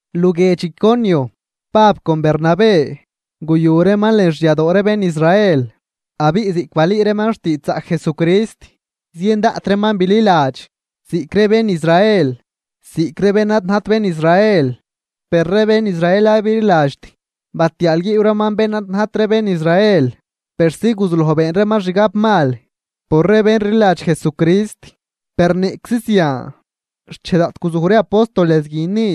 Luguiedx Iconio, Pab con Bernabé guyu reeman lën xyadoo ree bén Israel. Abiꞌ ziꞌc balüü reeman xtiidxzaꞌc Jesucrist, zien daꞌt reeman bililadx, ziꞌc ree bén Israel ziꞌc ree bén ad najt bén Israel. Per ree bén Israel ad bililadxt batiaalguiiw reeman bén ad najt ree bén Israel persi guzuloj been reeman xgab mal por ree bén rliladx Jesucrist. Per niꞌczi zian, xchej daꞌt guzuj ree apóstoles guin ni,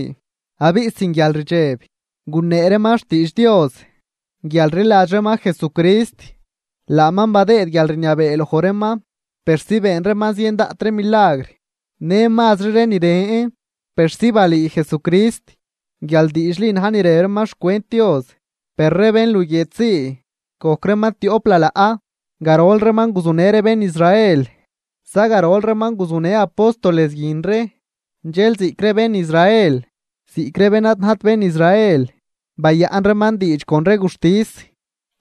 abiꞌ sin guialrdxeb gunee reeman xtiidx Dios guial rliladx reeman Jesucrist, laaman badëëd guialrniabee loj reeman persi been reeman zien daꞌt ree milagr në mazri ree ni ren, persi balüü Jesucrist guial diidxli na̱j ni rëb reeman xcwent Dios. Per ree bén luguiedx zii gojc reeman tioꞌp lalaꞌ, garol reeman guzunë ree bén Israel zagarol reeman guzunë apóstoles guin ree. Dxel ziꞌc ree bén Israel ziꞌc ree bén ad najt bén Israel, bayaꞌn reeman diidx con ree guxtis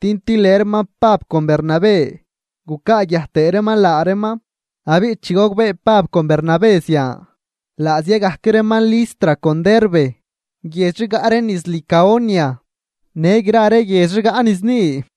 din tilë reeman Pab con Bernabé gucaaguiaj tëë reeman laa reeman. Abiꞌ chi gogbee Pab con Bernabé zian, laa zia gajc reeman Listra con Derbe, guiedx rigaꞌ ree niz Licaonia, në gra ree guiedx rigaꞌ niz ni,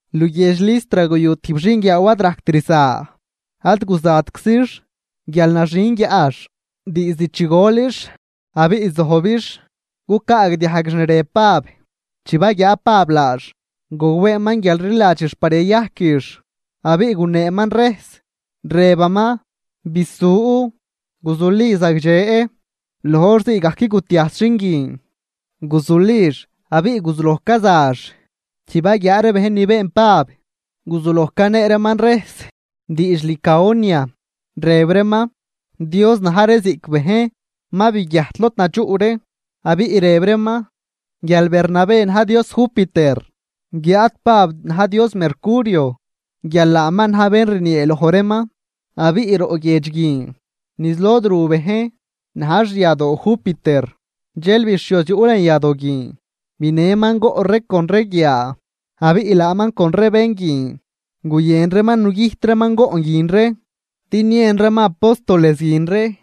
Luguiedx Listra guyu tijb xinguiaaw ad rajct rza, ad guzatczix guial naxin guiaꞌx diizd chi golix abiꞌ zojbix cucaagdiajguix ni rëb Pab. Chi baguiaa Pab laax, gogbeeman guial rliladxix par yayajquix. Abiꞌ guneeman rejs, rëbaman: ―¡Bisu, guzuli zagdxe! Loj hor zii gajc gutiajs xin guin, guzulix abiꞌ guzuloj cazax. Chi baguiaa ree bejn ni been Pab, guzuloj canee reeman rejs diidx Licaonia, rëb reeman: ―Dios na̱j ree ziꞌc bejn ma biguiajt lod nadxuꞌ ree. Abiꞌ rëb reeman guial Bernabé na̱j dios Júpiter, guiáad Pab na̱j dios Mercurio guial laaman na̱j bén rniee loj reeman. Abiꞌ roꞌ guiedx guin niz lod ru bejn na̱j xyadoo Júpiter, dxel bixhioz yuꞌ lën yadoo guin binëman goꞌn ree con ree guiaa, abiꞌ laaman con ree bén guin guyën reeman nugüjt reeman goꞌn guin ree din niën reeman apóstoles guin ree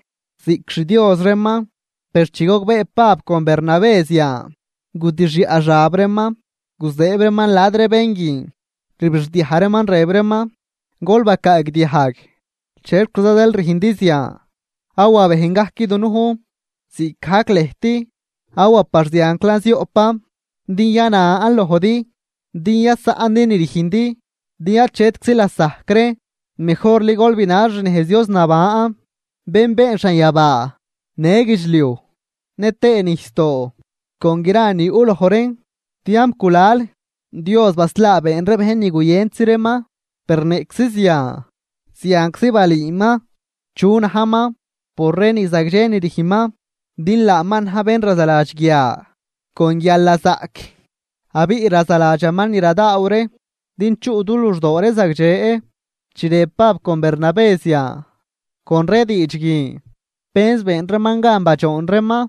ziꞌc xdios reeman. Per chi gogbee Pab con Bernabé zian, gudixyaꞌ xab reeman, guzëëb reeman la̱d ree bén guin, rbixdiaj reeman rëb reeman: ―Gol bacaagdiajg, ¿chexquiza zeel rüjndi zian, awa bejn gajc dunujn ziꞌcgajc lëjt? Awa par zianclan zioꞌpan din yanan lojdi din yasaꞌndi ni rüjndi, din achetczi lasajc reen. Mejorli gol binal xnejz Dios naban, bén been xanyabaa në guidxliuj nëtëë nijsdoo con gra ni yuꞌ loj reen. Tiamp gulal Dios baslaa been ree bejn ni guyëntzi reeman. Per niꞌczi zian, zianczi balüüman chu najman por ree ni zagdxe ni rüjnman. Din laaman na̱j bén razaladx guia con guialnazaꞌc abiꞌ razaladxaman ni radaaw ree din chuꞌ du luxdoo ree zagdxe. Chi rëb Pab con Bernabé zian, con ree diidx guin penz been reeman gan badxoon reeman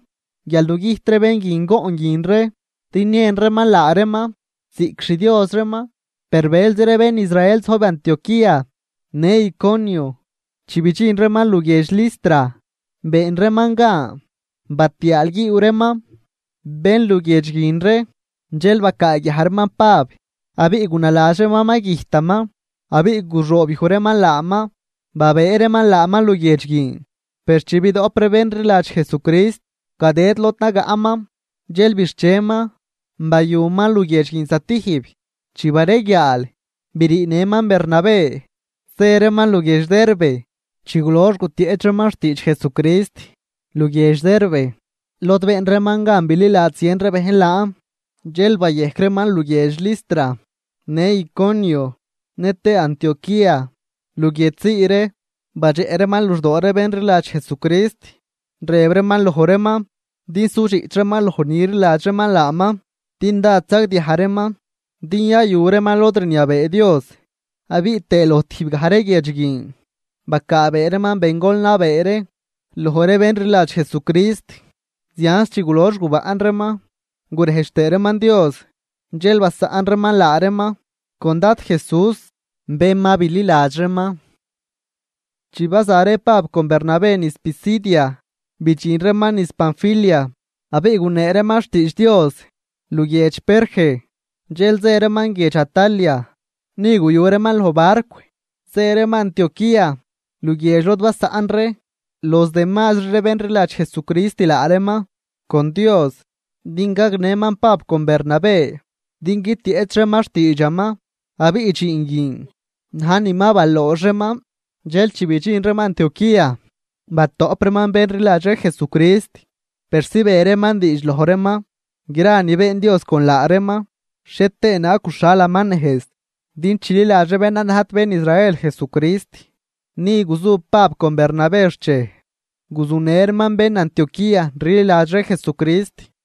guial nugüjt ree bén guin goꞌn guin ree din niën reeman laa reeman ziꞌc xdios reeman. Per bëlzi ree bén Israel zojb Antioquía në Iconio, chi bidxin reeman luguiedx Listra been reeman gan batiaalguiiw reeman bén luguiedx guin ree. Dxel bacaaguiaj reeman Pab abiꞌ gunaladx reeman ma güjtaman abiꞌ guxoobyuj reeman laaman, babëë reeman laaman luguiedx guin. Per chi bidoꞌp ree bén rliladx Jesucrist gadëd lod nagaꞌman, dxel bixcheman, bayuman luguiedx guin stijb. Chi bareguiaal briinëman Bernabé zë reeman luguiedx Derbe. Chi gulox gutieꞌch reeman xtiidxzaꞌc Jesucrist luguiedx Derbe lod been reeman gan bililadx zien ree bejn laan, dxel bayejc reeman luguiedx Listra në Iconio nëtëë Antioquía. Luguiedx zii ree badxeꞌ reeman luxdoo ree bén rliladx Jesucrist. Rëb reeman loj reeman din sudxiꞌch reeman loj ni rliladx reeman laaman, din dád sagdiaj reeman din yayu reeman lod rniabee Dios. Abiꞌ tëë loj tijb gaj ree guiedx guin bacaabee reeman bengol nabee ree loj ree bén rliladx Jesucrist. Zianz chi gulox gubaꞌn reeman gurejdx tëë reeman Dios, dxel basaꞌn reeman laa reeman con Dad Jesús bén ma bililadx reeman. Chi baza ree Pab con Bernabé niz Pisidia, bidxin reeman niz Panfilia. Abiꞌ gunee reeman xtiidx Dios luguiedx Perge, dxel zë reeman guiedx Atalia. Ni guyu reeman loj barcw zë reeman Antioquía, luguiedx lod basaꞌn ree los demazri ree bén rliladx Jesucrist laa reeman con Dios din gagnëman Pab con Bernabé din guitieꞌch reeman xtiidxaman. Abiꞌ dxiin guin na̱j ni ma baloox reeman. Dxel chi bidxin reeman Antioquía, batoꞌp reeman bén rliladx ree Jesucrist, persi be reeman diidx loj reeman gra ni been Dios con laa reeman, xhie tëë naag guxhalaman nejz din chililadx ree bén ad najt bén Israel Jesucrist. Ni guzu Pab con Bernabé xchej, guzunë reeman bén Antioquía rliladx ree Jesucrist.